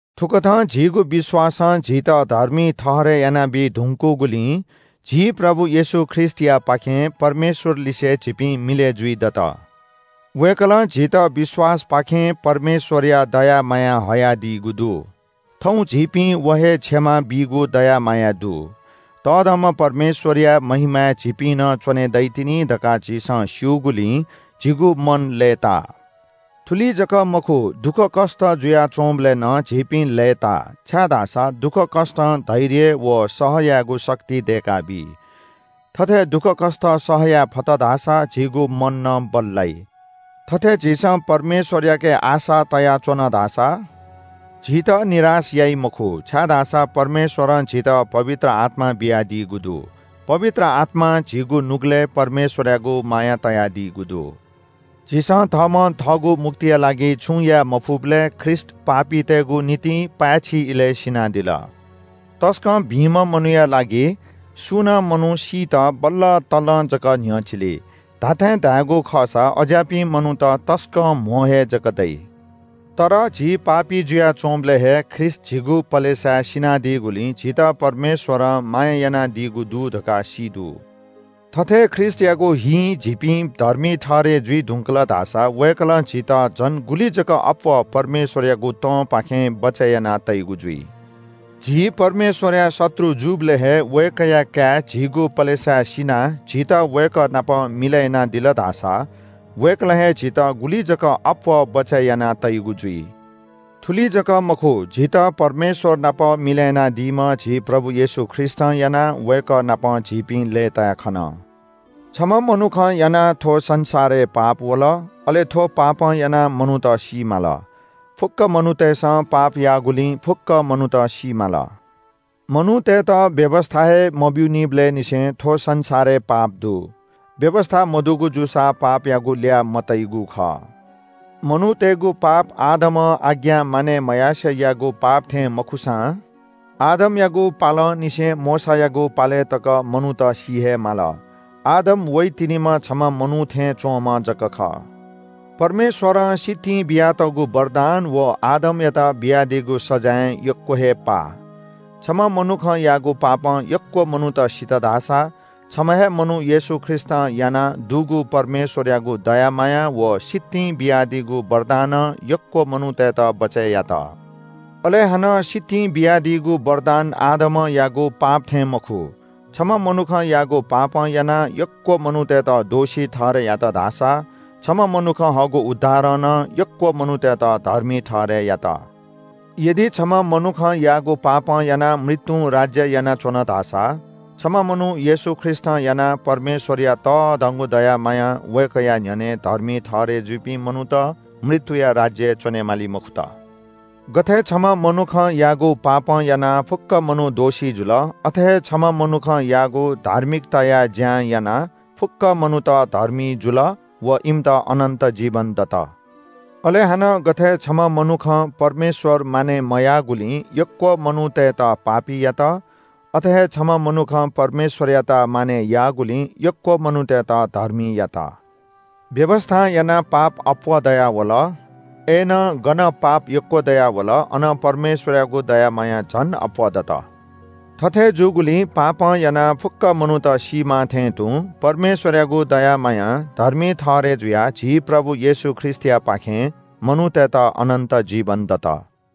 थुकथं झीगु विश्‍वासं झीत धर्मी ठहरय् यानाबी धुंकूगुलिं झी प्रभु येशू ख्रीष्‍टयापाखें परमेश्‍वरलिसे झीपिं मिलय् जुइदत। वय्‌कलं झीत विश्‍वासपाखें परमेश्‍वरया दया मायाय् हयादीगु दु। थौं झीपिं व हे क्षमा बीगु दया मायाय् दु। तःधंम्‍ह परमेश्‍वरया महिमाय् झीपिं नं च्‍वने दइतिनि धकाः झीसं स्‍यूगुलिं झीगु मन लय्‌ताः। थुलि जक मखु, दुःखकष्‍ट जुयाच्‍वंबलय् नं झीपिं लय्‌ताः, छाय्‌धाःसा दुःखकष्‍टं धैर्य व सह यायेगु शक्ति दय्‌काबी। थथे दुःख सह यायेफत धाःसा झीगु मन नं बल्‍लाइ। थथे झीसं परमेश्‍वरयाके आशा तयाच्‍वन धाःसा झीत निराश याइ मखु, छाय्‌धाःसा परमेश्‍वरं झीत पवित्र आत्‍मा बियादीगु दु। पवित्र आत्‍मां झीगु नुगलय् परमेश्‍वरयागु माया तयादीगु दु। झीसं थःम्‍हं थःगु मुक्तिया लागि छुं याये मफुबलय् ख्रीष्‍ट पापीतय्‌गु निंतिं पाय्‌छि इलय् सिनादिल। तसकं भिंम्‍ह मनूया लागि सुं नं मनू सीत बल्‍लतल्‍लं जक न्‍ह्यचिली। धात्‍थें धायेगु खःसा अज्‍याःपिं मनूत तसकं कम हे जक दइ। तर झी पापी जुयाच्‍वंबलय् हे ख्रीष्‍ट झीगु पलेसाय् सिनादीगुलिं झीत परमेश्‍वरं माया यानादीगु दु धकाः सी दु। थथे ख्रीष्‍टयागु हिं झीपिं धर्मी ठहरय् जुइ धुंकल धाःसा वय्‌कलं झीत झन गुलि जक अप्‍वः परमेश्‍वरयागु तंपाखें बचय् याना तइगु जुइ। झीपिं परमेश्‍वरया शत्रु जूबलय् हे वय्‌कःया काय् झीगु पलेसाय् सिनाः झीत वय्‌कः नाप मिलय् यानादिल धाःसा वय्‌कलं हे झीत गुलि जक अप्‍वः बचय् याना तइगु जुइ। थुलि जक मखु, झीत परमेश्‍वर नाप मिलय् यानादीम्‍ह झी प्रभु येशू ख्रीष्‍टं यानाः वय्‌कः नाप झीपिं लय्‌ताय् खन। छम्‍ह मनुखं यानाः थ्‍व संसारय् पाप वल। अले थ्‍व पापं यानाः मनूत सी माल। फुक्‍क मनूतय्‌सं पाप याःगुलिं फुक्‍क मनूत सी माल। मनूतय्‌त व्‍यवस्‍था हे मब्‍यूनिबलय् निसें थ्‍व संसारय् पाप दु। व्‍यवस्‍था मदुगु जूसा पापयागु ल्‍याः मतइगु खः। मनूतय्‌गु पाप आदमं आज्ञा मानय् मयासें याःगु पाप थें मखुसां आदमयागु पालंनिसें मोशायागु पालय् तक मनूत सी हे माल। आदम वइतिनिम्‍ह छम्‍ह मनू थें च्‍वंम्‍ह जक खः। परमेश्‍वरं सितिं बियातःगु वरदान व आदमयात बियादीगु सजाँय यक्‍व हे पाः। छम्‍ह मनुखं याःगु पापं यक्‍व मनूत सित धाःसा छम्‍ह हे मनू येशू ख्रीष्‍टं यानाः दुगु परमेश्‍वरयागु दया माया व सितिं बियादीगु वरदानं यक्‍व मनूतय्‌त बचय् यात। अले हानं सितिं बियादीगु वरदान आदमं याःगु पाप थें मखु। छम्‍ह मनुखं याःगु पापं यानाः यक्‍व मनूतय्‌त दोषी ठहरय् यात धाःसा छम्‍ह मनुखं हःगु उद्धारं नं यक्‍व मनूतय्‌त धर्मी ठहरय् यात। यदि छम्‍ह मनुखं याःगु पापं यानाः मृत्‍युं राज्‍य यानाच्‍वन धाःसा छम्‍ह मनू येशू ख्रीष्‍टं यानाः परमेश्‍वरया तःधंगु दया मायां वय्‌कःया न्‍ह्यःने धर्मी ठहरय् जुइपिं मनूत मृत्‍युया राज्‍यय् च्‍वनेमाली मखुत। गथे छम्‍ह मनुखं याःगु पापं यानाः फुक्‍क मनू दोषी जुल, अथे हे छम्‍ह मनुखं याःगु धार्मिकताया ज्‍यां यानाः फुक्‍क मनूत धर्मी जुल व इमित अनन्‍त जीवन दत। अले हानं गथे छम्‍ह मनुखं परमेश्‍वर मानय् मयाःगुलिं यक्‍व मनूतय्‌त पापी यात, अथे हे छम्‍ह मनुखं परमेश्‍वरयात मानय् याःगुलिं यक्‍व मनूतय्‌त धर्मी यात। व्‍यवस्‍थां यानाः पाप अप्‍वः दयावल। अय्‌नं गन पाप यक्‍व दयावल, अन परमेश्‍वरयागु दया माया झन अप्‍वः दत। थथे जूगुलिं पापं यानाः फुक्‍क मनूत सीमाः थें तुं परमेश्‍वरयागु दया मायां धर्मी ठहरय् जुयाः झी प्रभु येशू ख्रीष्‍टयापाखें मनूतय्‌त अनन्‍त जीवन दत।